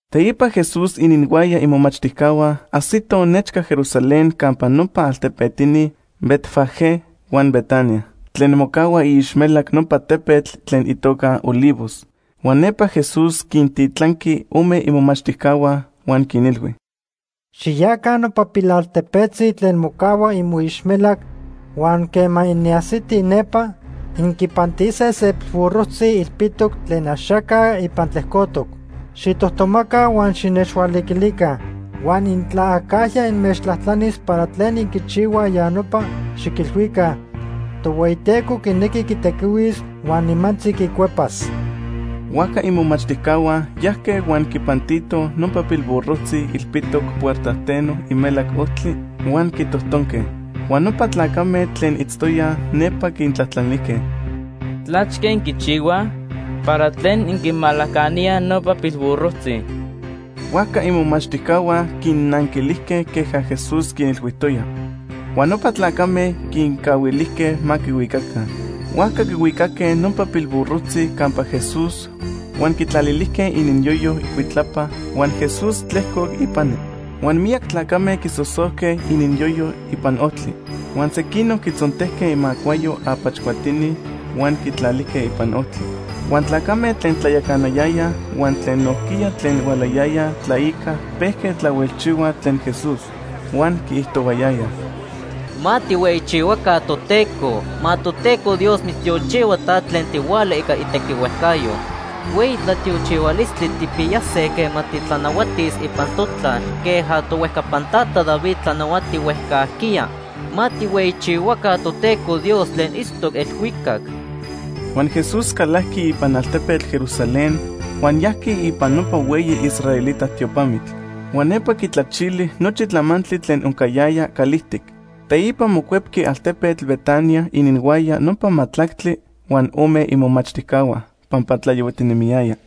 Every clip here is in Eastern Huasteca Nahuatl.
Teipa Jesús ininhuaya imomachtijcahua ajsitoj nechca Jerusalén campa nopa altepetini Betfagé huan Betania, tlen mocahua iixmelac nopa tepetl tlen itoca Olivos. Huan nepa Jesús quintitlanqui ome imomachtijcahua, huan quinilhui: ―Xiyaca nopa pilaltepetzi tlen mocahua imoixmelac huan quema inajsitij nepa, inquipantise se pilburrojtzi ilpitoc tlen axaca ipan tlejcotoc. Xijtojtomaca huan xinechhualiquilica. Huan intla acajya inmechtlajtlanis para tlen inquichihuaj ya nopa, xiquilhuica: ‘Tohueyiteco quinequi quitequihuis huan nimantzi quicuepas.’ Huajca imomachtijcahua yajque huan quipantitoj nopa pilburrojtzi ilpitoc puertajteno imelac ojtli huan quitojtonque. Huan nopa tlacame tlen itztoyaj nepa quintlajtlanijque: ―¿Tlachque inquichihuaj? ¿Para tlen inquimalacaníaj nopa pilburrojtzi? Huajca imomachtijcahua quinnanquilijque queja Jesús quinilhuijtoya. Huan nopa tlacame quincahuilijque ma quihuicaca. Huajca quihuicaque nopa pilburrojtzi campa Jesús huan quitlalilijque ininyoyo icuitlapa huan Jesús tlejcoc ipani. Huan miyac tlacame quisosojque ininyoyo ipan ojtli, huan sequinoc quitzontejque imacuayo apach cuatini huan quitlalijque ipan ojtli. Huan tlacame tlen tlayacanayayaj huan tlen nojquiya tlen hualayayaj tlaica pejque tlahuelchihuaj tlen Jesús, huan quiijtohuayayaj: ―¡Ma tijhueyichihuaca Toteco! Ma Toteco Dios mitztiochihua ta tlen tihuala ica itequihuejcayo. ¡Hueyi tlatiochihualistli tijpiyase quema titlanahuatis ipan totlal queja tohuejcapan tata David tlanahuati huejcajquiya! ¡Ma tijhueyichihuaca Toteco Dios tlen itztoc elhuicac! Huan Jesús calajqui ipan altepetl Jerusalén huan yajqui ipan nopa hueyi israelita tiopamitl. Huan nepa quitlachili nochi tlamantli tlen oncayaya calijtic. Teipa mocuepqui altepetl Betania ininhuaya nopa majtlactli huan ome imomachtijcahua pampa tlayohuatinemiyaya.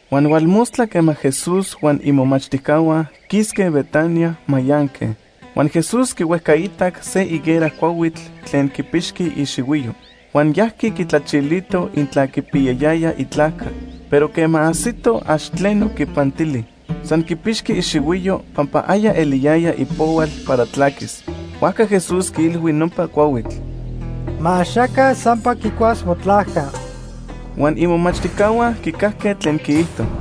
Huan hualmostla quema Jesús huan imomachtijcahua quisque Betania, mayanque. Huan Jesús quihuejcaitac se higuera cuahuitl tlen quipixqui ixihuiyo. Huan yajqui quitlachilito intla quipiyayaya itlajca. Pero quema ajsito, ax tleno quipantili, san quipixqui ixihuiyo pampa aya eliyaya ipohual para tlaquis. Huajca Jesús quiilhui nopa cuahuitl: ―Ma axaca sampa quicuas motlajca. Huan imomachtijcahua quicajque tlen quiijto.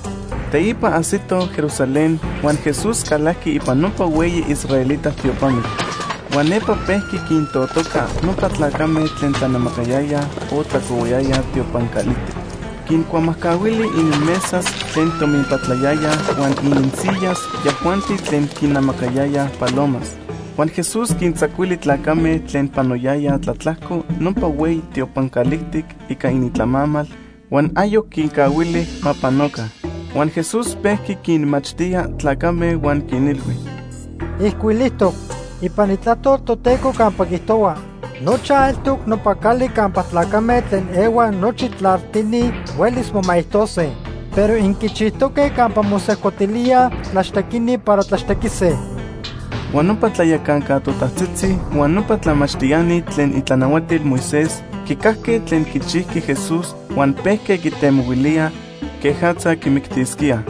Teipa ajsitoj Jerusalén huan Jesús calajqui ipan nopa hueyi israelita tiopamitl. Huan nepa pejqui quintotoca nopa tlacame tlen tlanamacayayaj o tlacohuayayaj tiopan calijtic. Quincuamajcahuili ininmesas tlen tominpatlayayaj huan ininsiyas yajuanti tlen quinamacayayaj palomas. Huan Jesús quintzacuili tlacame tlen panoyayaj tlatlajco nopa hueyi tiopan calijtic ica inintlamamal huan ayoc quincahuili ma panoca. Huan Jesús pejqui quinmachtía tlacame huan quinilhui: ―Ijcuilijtoc ipan Itlajtol Toteco campa quiijtohua: ‘Nochaj eltoc nopa cali campa tlacame tlen ehuaj nochi tlaltini huelis momaijtose’, pero inquichijtoque campa mosejcotilíaj tlaxtequini para tlaxtequise. Huan nopa tlayacanca totajtzitzi huan nopa tlamachtiani tlen itlanahuatil Moisés quicajque tlen quichijqui Jesús huan pejque quitemohuilíaj quejatza quimictisquíaj.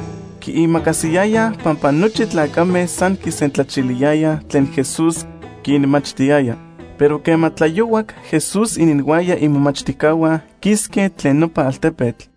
Quiimacasiyayaj pampa nochi tlacame san quisentlachiliyayaj tlen Jesús quinmachtiyaya. Pero quema tlayohuac, Jesús ininhuaya imomachtijcahua quisque tlen nopa altepetl.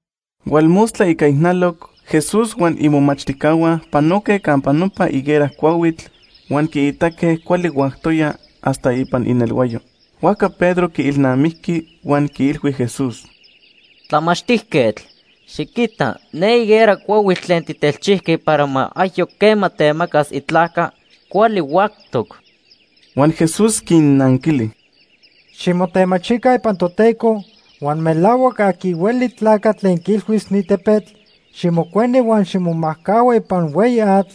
Hualmostla ica ijnaloc Jesús huan imomachtijcahua panoque campa nopa higuera cuahuitl huan quiitaque cuali huactoya hasta ipan inelhuayo. Huajca Pedro quiilnamijqui huan quiilhui Jesús: ―Tlamachtijquetl, xiquita ne higuera cuahuitl tlen tijtelchijqui para ma ayoc quema temacas itlajca, cuali huactoc. Huan Jesús quinnanquili: ―Ximotemachica ipan Toteco, huan melahuac aqui hueli tlacatl tlen quiilhuis ni tepetl: ‘Ximijcueni huan ximomajcahua ipan hueyi atl’,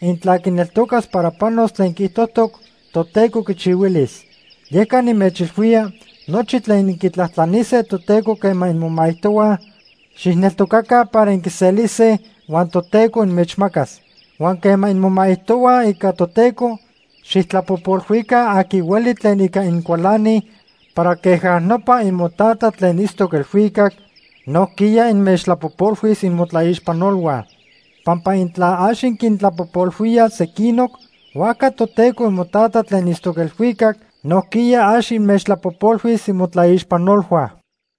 intla quineltocas para panos tlen quiijtojtoc, Toteco quichihuilis. Yeca nimechilhuía, nochi tlen inquitlajtlanise Toteco quema inmomaijtohuaj, xijneltocaca para inquiselise huan Toteco inmechmacas. Huan quema inmomaijtohuaj ica Toteco, xijtlapojpolhuica aqui hueli tlen ica incualanij para queja nopa imoTata tlen itztoc elhuicac nojquiya inmechtlapojpolhuis imotlaixpanolhua. Pampa intla ax inquintlapojpolhuíaj sequinoc, huajca Toteco imoTata tlen itztoc elhuicac nojquiya ax inmechtlapojpolhuis imotlaixpanolhua.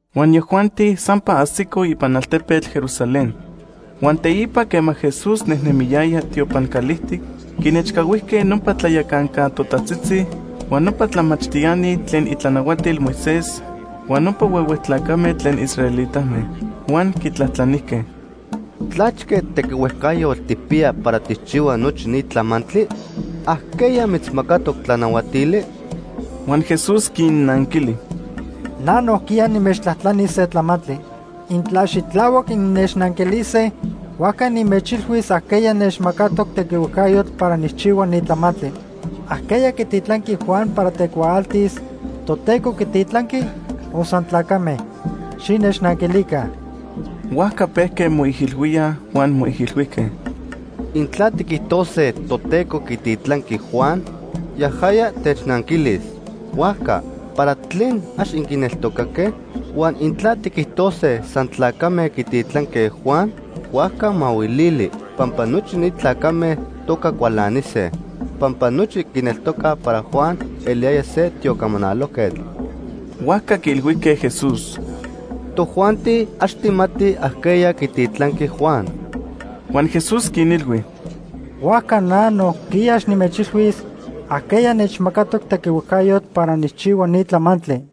Huan yajuanti sampa ajsicoj ipan altepetl Jerusalén. Huan teipa quema Jesús nejnemiyaya tiopan calijtic, quinechcahuijque nopa tlayacanca totajtzitzi, huan nopa tlamachtiani tlen itlanahuatil Moisés huan nopa huehue tlacame tlen israelitame. Huan quitlajtlanijque: ―¿Tlachque tequihuejcayotl tijpiya para tijchihua nochi ni tlamantli? ¿Ajqueya mitzmacatoc tlanahuatili? Huan Jesús quinnanquili: ―Na nojquiya nimechtlajtlanis se tlamantli. Intla xitlahuac innechnanquilise, huajca nimechilhuis ajqueya nechmacatoc tequihuejcayotl para nijchihua ni tlamantli. ¿Ajqueya quititlanqui Juan para tecuaaltis? ¿Toteco quititlanqui o san tlacame? Xinechnanquilica. Huajca pejque moijilhuíaj huan moijilhuijque: “Intla tiquijtose Toteco quititlanqui Juan, yajaya technanquilis: ‘Huajca, ¿para tlen ax inquineltocaque?’ Huan intla tiquijtose san tlacame quititlanque Juan, huajca mahuilili, pampa nochi ni tlacame toca cualanise, pampa nochi quineltocaj para Juan eliyaya se tiocamanalojquetl.” Huajca quiilhuijque Jesús: ―Tojuanti ax tijmatij ajqueya quititlanqui Juan. Huan Jesús quinilhui: ―Huajca na nojquiya ax nimechilhuis ajqueya nechmacatoc tequihuejcayotl para nijchihua ni tlamantli.